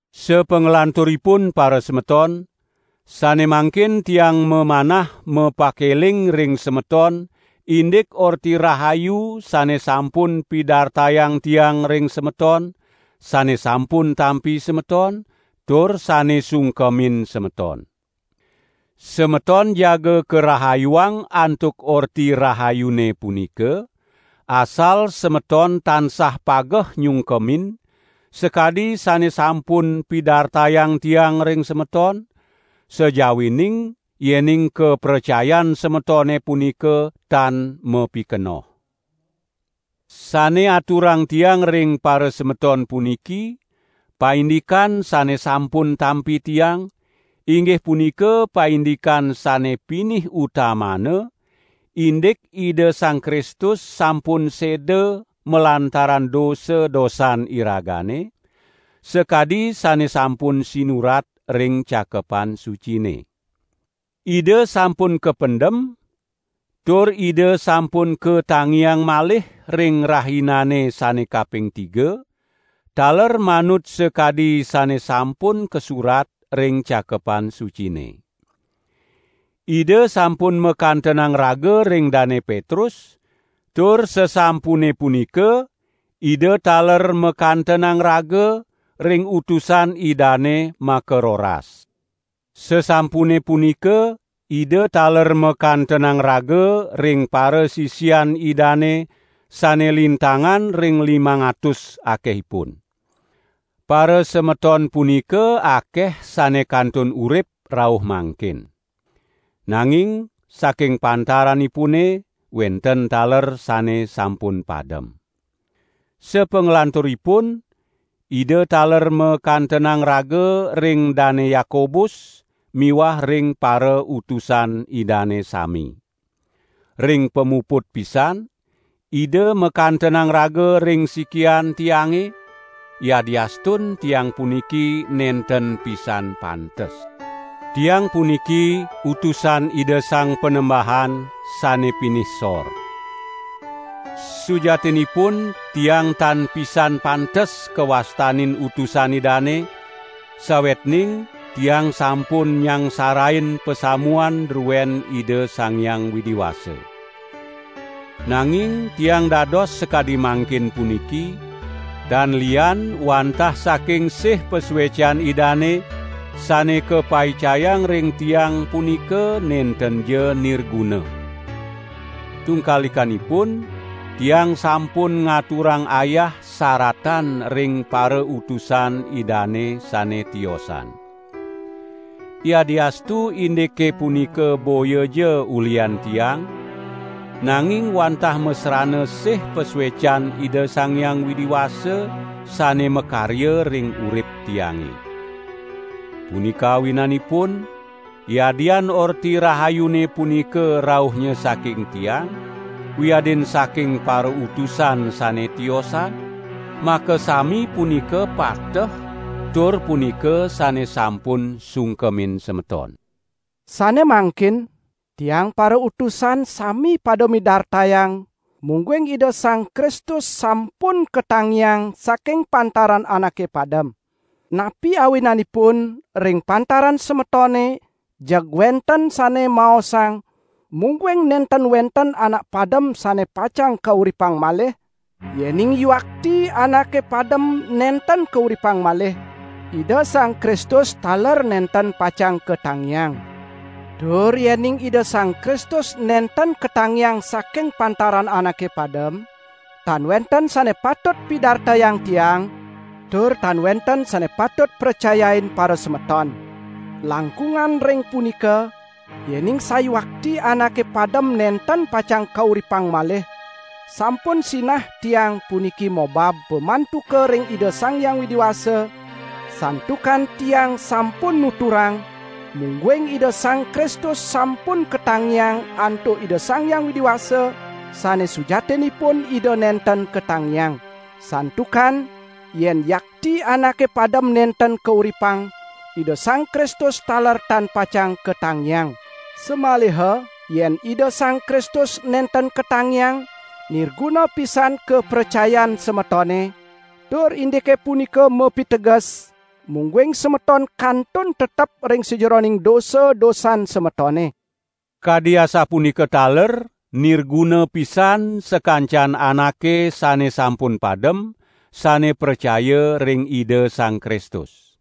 Sapanglanturipun parasemeton, sane mangkin tiang mamanah mapakeling ring semeton indik Orti Rahayu sane sampun pidartayang tiang ring semeton, sane sampun tampi semeton, tur sane sungkemin semeton. Semeton jaga karahayuang antuk Orti Rahayune punika, asal semeton tansah pageh nyungkemin, sakadi sane sampun pidartayang tiang ring semeton, sajawining yening kapracayan semetone punika tan mapikenoh. Sane aturang tiang ring parasemeton puniki, paindikan sane sampun tampi tiang, inggih punika paindikan sane pinih utamana, indik Ida Sang Kristus sampun seda malantaran dosa-dosan iragane, sakadi sane sampun sinurat ring Cakepan Sucine. Ida sampun kapendem, tur Ida sampun katangiang malih ring rahinane sane kaping tiga, taler manut sakadi sane sampun kasurat ring Cakepan Sucine. Ida sampun makantenang raga ring Dane Petrus, tur sasampune punika Ida taler makantenang raga ring utusan Idane makaroras. Sasampune punika Ida taler makantenang raga ring parasisian Idane sane lintangan ring limang atus akehipun. Parasemeton punika akeh sane kantun urip rauh mangkin. Nanging saking pantaranipune wenten taler sane sampun padem. Sapanglanturipun Ida taler makantenang raga ring Dane Yakobus miwah ring parautusan Idane sami. Ring pamuput pisan Ida makantenang raga ring sikian tiange, yadiastun tiang puniki nenten pisan pantes. Tiang puniki utusan Ida Sang Panembahan, sane pinih sor. Sujatinipun tiang tan pisan pantes kawastanin utusan Idane, sawetning tiang sampun nyangsarain pasamuan druen Ida Sang Hyang Widi Wasa. Nanging tiang dados sakadi mangkin puniki, tan lian wantah saking sih pasuecan Idane sane kapaicayang ring tiang punika nentenja nirguna. Tungkalikanipun, tiang sampun ngaturang ayah saratan ring parautusan Idane sane tiosan. Yadiastu indike punika boyaja ulihan tiang, nanging wantah masrana sih pasuecan Ida Sang Hyang Widi Wasa sane makarya ring urip tiange. Punika awinanipun, yadian Orti Rahayune punika rauhnya saking tiang, wiadin saking parautusan sane tiosan, makasami punika pateh tur punika sane sampun sungkemin semeton. Sane mangkin, tiang parautusan sami pada midartayang mungguing Ida Sang Kristus sampun katangiang saking pantaran anake padem. Napi awinanipun ring pantaran semetone jeg wenten sane maosang mungguing nenten wenten anak padem sane pacang kauripang malih? Yening yuakti anake padem nenten kauripang malih, Ida Sang Kristus taler nenten pacang katangiang. Tur yening Ida Sang Kristus nenten katangiang saking pantaran anake padem, tan wenten sane patut pidartayang tiang, tur tan wenten sane patut pracayain parasemeton. Langkungan ring punika, yening sawiakti anake padem nenten pacang kauripang malih, sampun sinah tiang puniki mobab pamantuka ring Ida Sang Hyang Widi Wasa, santukan tiang sampun nuturang, mungguing Ida Sang Kristus sampun katangiang antuk Ida Sang Hyang Widi Wasa, sane sujatinipun Ida nenten katangiang. Santukan yen yakti anake padem nenten kauripang, Ida Sang Kristus taler tan pacang katangiang. Samaliha yen Ida Sang Kristus nenten katangiang, nirguna pisan kapracayan semetone, tur indike punika mapiteges, mungguing semeton kantun tetep ring sajeroning dosa-dosan semetone. Kadi asapunika taler nirguna pisan sakancan anake sane sampun padem, sane pracaya ring Ida Sang Kristus.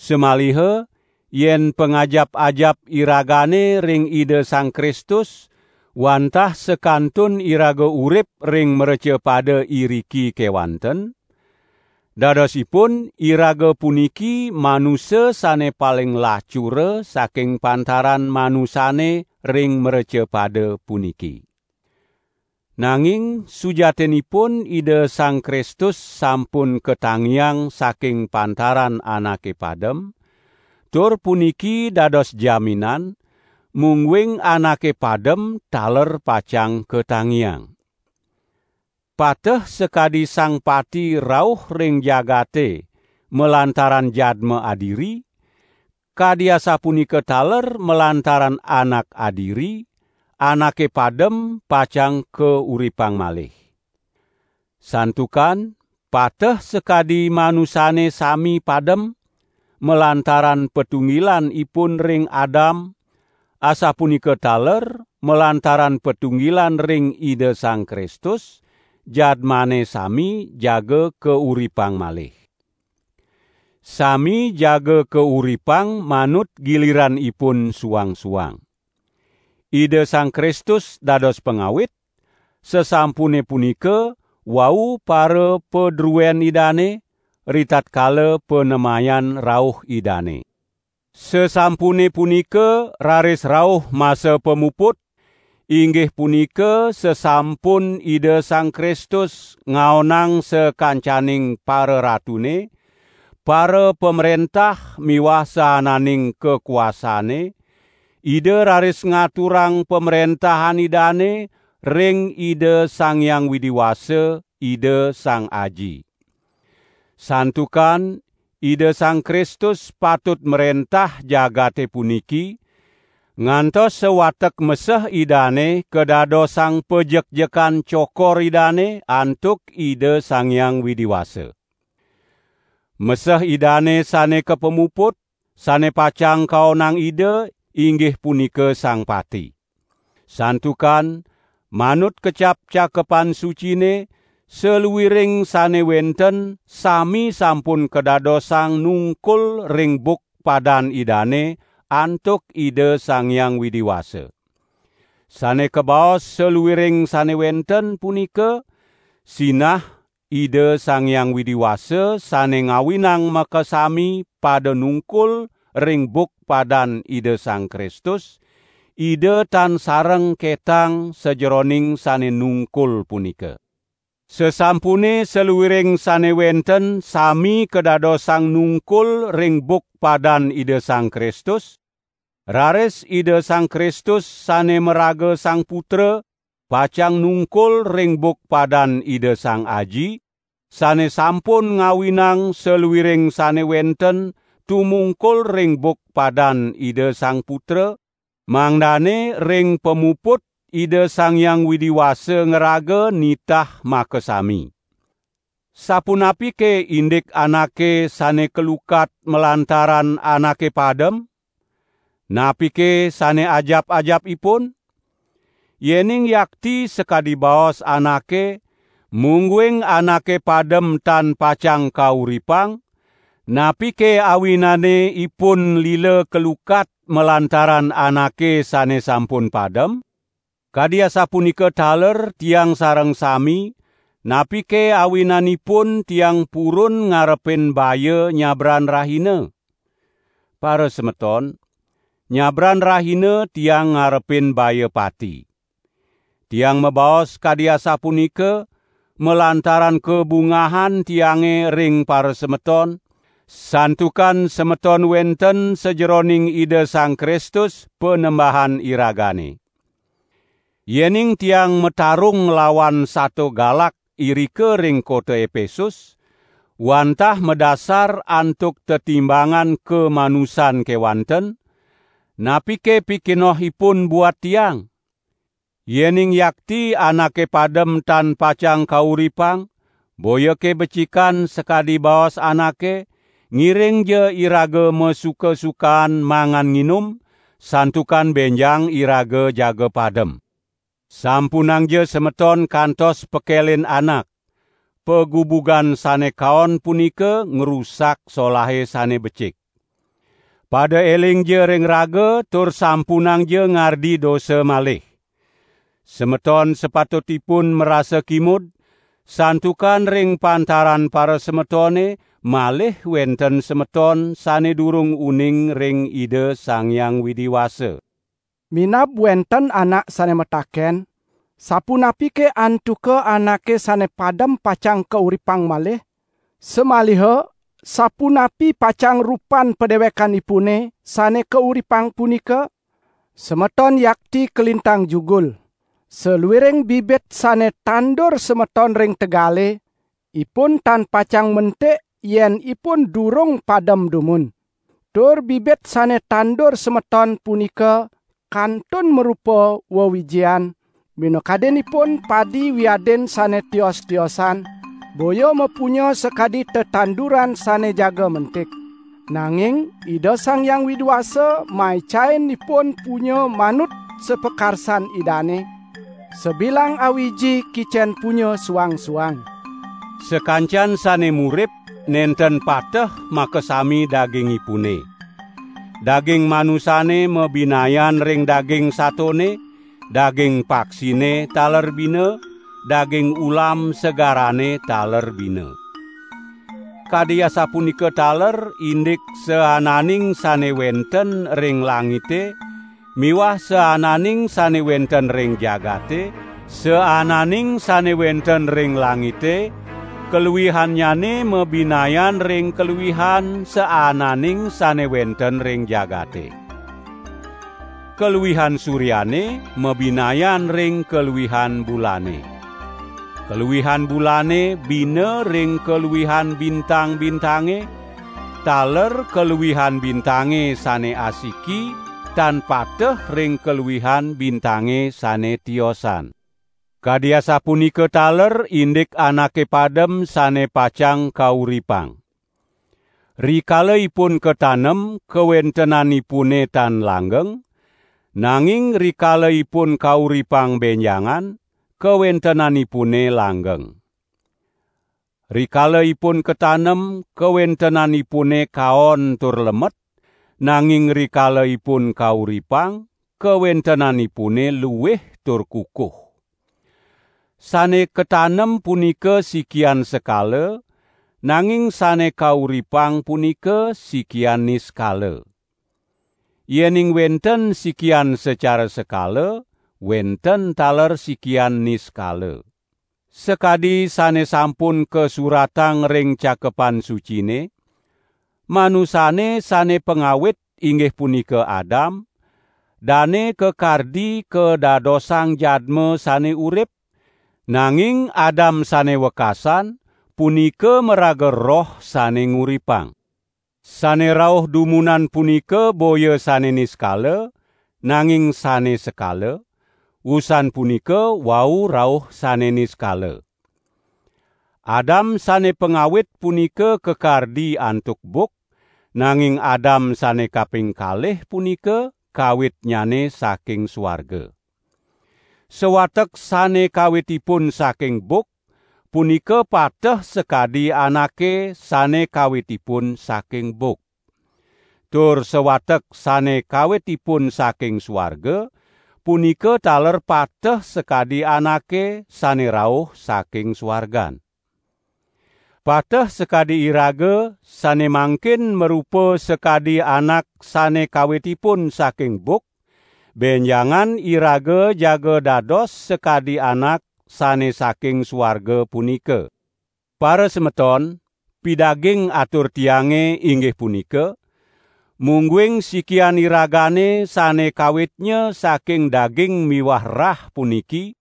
Samaliha yen pangajap-ajap iragane ring Ida Sang Kristus, wantah sakantun iraga urip ring mrecapada iriki kewanten, dadosipun iraga puniki manusa sane paling lacura saking pantaran manusane ring mrecapada puniki. Nanging sujatinipun Ida Sang Kristus sampun katangiang saking pantaran anake padem, tur puniki dados jaminan, mungguing anake padem taler pacang katangiang. Pateh sakadi Sang Pati rauh ring jagate malantaran jadma adiri, kadi asapunika taler malantaran Anak adiri, anake padem pacang kauripang malih. Santukan pateh sakadi manusane sami padem, malantaran patunggilan ipun ring Adam, asapunika taler malantaran patunggilan ring Ida Sang Kristus, jadmane sami jaga kauripang malih. Sami jaga kauripang manut giliran ipun suang-suang. Ida Sang Kristus dados pangawit, sasampune punika wau parapadruen Idane, ritatkala panemayan rauh Idane. Sasampune punika raris rauh masa pamuput; inggih punika sasampun Ida Sang Kristus ngaonang sakancaning pararatune, parapamrentah miwah saananing kakuasane, Ida raris ngaturang pamrentahan Idane ring Ida Sang Hyang Widi Wasa, Ida Sang Aji. Santukan Ida Sang Kristus patut mrentah jagate puniki, ngantos sawatek meseh Idane kadadosang panjekjekan cokor Idane antuk Ida Sang Hyang Widi Wasa. Meseh Idane sane kapamuput, sane pacang kaonang Ida, inggih punika Sang Pati. Santukan manut kecap Cakepan Sucine saluiring sane wenten sami sampun kadadosang nungkul ring buk padan Idane antuk Ida Sang Hyang Widi Wasa. Sane kabaos "saluiring sane wenten" punika, sinah Ida Sang Hyang Widi Wasa sane ngawinang makasami pada nungkul ring buk padan Ida Sang Kristus, Ida tan sareng ketang sajeroning sane nungkul punika. Sasampune saluiring sane wenten sami kadadosang nungkul ring buk padan Ida Sang Kristus, raris Ida Sang Kristus sane maraga Sang Putra pacang nungkul ring buk padan Ida Sang Aji, sane sampun ngawinang saluiring sane wenten tumungkul ring buk padan Ida Sang Putra, mangdane ring pamuput Ida Sang Hyang Widi Wasa ngraga nitah makasami. Sapunapike indik anake sane kalukat malantaran anake padem? Napike sane ajap-ajap ipun? Yening yakti sakadi baos anake, mungguing anake padem tan pacang kauripang, napike awinane ipun lila kalukat malantaran anake sane sampun padem? Kadi asapunika taler tiang sareng sami, napike awinanipun tiang purun ngarepin baya nyabran rahina? Parasemeton, nyabran rahina tiang ngarepin baya pati. Tiang mabaos kadi asapunika, malantaran kabungahan tiange ring parasemeton, santukan semeton wenten sajeroning Ida Sang Kristus, Panembahan iragane. Yening tiang matarung nglawan sato galak irika ring kota Epesus, wantah madasar antuk tetimbangan kamanusan kewanten, napike pikenohipun buat tiang? Yening yakti anake padem tan pacang kauripang, boyake becikan sakadi baos anake: "Ngiringja iraga masuka-sukaan mangan nginum, santukan benjang iraga jaga padem." Sampunangja semeton kantos pekelin anak! "Pagubugan sane kaon punika ngrusak solahe sane becik." Pada elingja ring raga tur sampunangja ngardi dosa malih! Semeton sapatutipun marasa kimud, santukan ring pantaran parasemetone malih wenten semeton sane durung uning ring Ida Sang Hyang Widi Wasa. Minab wenten anak sane mataken: "Sapunapike antuka anake sane padem pacang kauripang malih? Samaliha sapunapi pacang rupan padewekanipune sane kauripang punika?" Semeton yakti kalintang jugul! Saluiring bibit sane tandur semeton ring tegale, ipun tan pacang mentik yen ipun durung padem dumun. Tur bibit sane tandur semeton punika kantun marupa wewijian, minakadinipun padi wiadin sane tios-tiosan, boya mapunya sakadi tetanduran sane jaga mentik. Nanging Ida Sang Hyang Widi Wasa maicain ipun punya manut sapakarsan Idane: sabilang awiji kicen punya suang-suang. Sakancan sane murip, nenten pateh makasami dagingipune. Daging manusane mabinayan ring daging satone, daging paksine taler bina, daging ulam segarane taler bina. Kadi asapunika taler indik saananing sane wenten ring langite miwah saananing sane wenten ring jagate; saananing sane wenten ring langite kaluihannyane mabinayan ring kaluihan saananing sane wenten ring jagate. Kaluihan suryane mabinayan ring kaluihan bulane. Kaluihan bulane bina ring kaluihan bintang-bintange, taler kaluihan bintange sane asiki tan pateh ring kaluihan bintange sane tiosan. Kadi asapunika taler indik anake padem sane pacang kauripang. Rikala ipun katanem kawentenanipune tan langgeng, nanging rikala ipun kauripang benjangan, kawentenanipune langgeng. Rikala ipun katanem kawentenanipune kaon tur lemet, nanging rikala ipun kauripang, kawentenanipune luih tur kukuh. Sane katanem punika sikian sekala, nanging sane kauripang punika sikian niskala. Yening wenten sikian secara sekala, wenten taler sikian niskala. Sakadi sane sampun kasuratang ring Cakepan Sucine: "Manusane sane pangawit inggih punika Adam, dane kakardi kadadosang jadma sane urip", nanging Adam sane wekasan, punika maraga Roh sane nguripang. Sane rauh dumunan punika boya sane niskala, nanging sane sekala; usan punika wau rauh sane niskala. Adam sane pangawit punika kakardi antuk buk, nanging Adam sane kaping kalih punika kawitnyane saking suarga. Sawatek sane kawitipun saking buk, punika pateh sakadi anake sane kawitipun saking buk. Tur sawatek sane kawitipun saking suarga, punika taler pateh sakadi anake sane rauh saking suargan. Pateh sakadi iraga sane mangkin marupa sakadi anak sane kawitipun saking buk, benjangan iraga jaga dados sakadi Anak sane saking suarga punika. Parasemeton, pidaging atur tiange, inggih punika: Mungguing sikian iragane sane kawitnya saking daging miwah rah puniki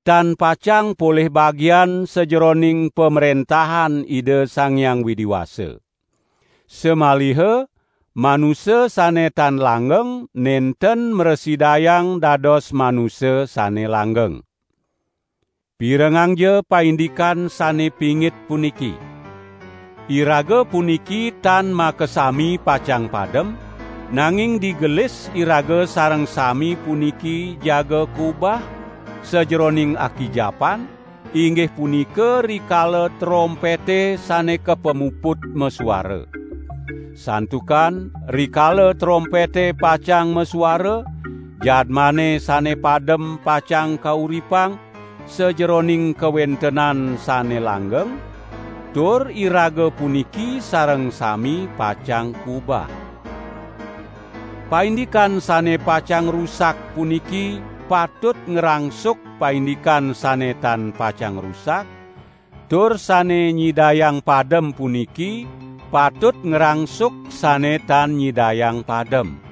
tan pacang polih bagian sajeroning pamrentahan Ida Sang Hyang Widi Wasa. Samaliha manusa sane tan langgeng nenten mrasidayang dados manusa sane langgeng. Pirengangja paindikan sane pingit puniki: Iraga puniki tan makasami pacang padem, nanging digelis iraga sareng sami puniki jaga kubah, sajeroning akijapan, inggih punika rikala trompete sane kapamuput masuara. Santukan rikala trompete pacang masuara, jadmane sane padem pacang kauripang sajeroning kawentenan sane langgeng, tur iraga puniki sareng sami pacang kubah. Paindikan sane pacang rusak puniki patut ngrangsuk paindikan sane tan pacang rusak, tur sane nyidayang padem puniki patut ngrangsuk sane tan nyidayang padem.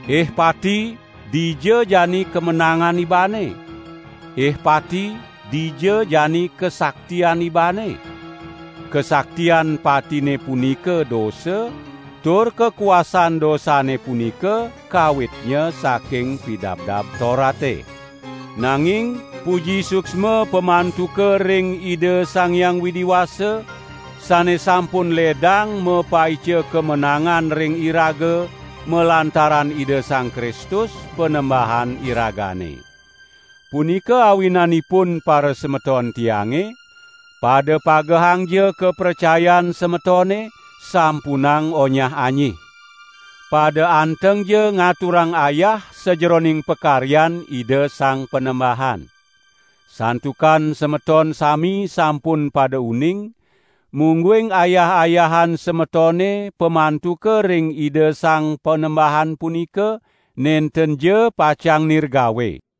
"Ih Pati dija jani kamenangan ibane? Ih Pati dija jani kasaktian ibane?" Kasaktian patine punika dosa, tur kakuasan dosane punika kawitnya saking Pidabdab Torate. Nanging puji suksma pamantuka ring Ida Sang Hyang Widi Wasa, sane sampun ledang mapaica kamenangan ring iraga malantaran Ida Sang Kristus, Panembahan iragane. Punika awinanipun parasemeton tiange, pada pagehangja kapracayan semetone, sampunang onyah-anyih. Pada antengja ngaturang ayah sajeroning pakaryan Ida Sang Panembahan! Santukan semeton sami sampun pada uning, mungguing ayah-ayahan semetone pamantuka ring Ida Sang Panembahan punika, nentenja pacang nirgawe.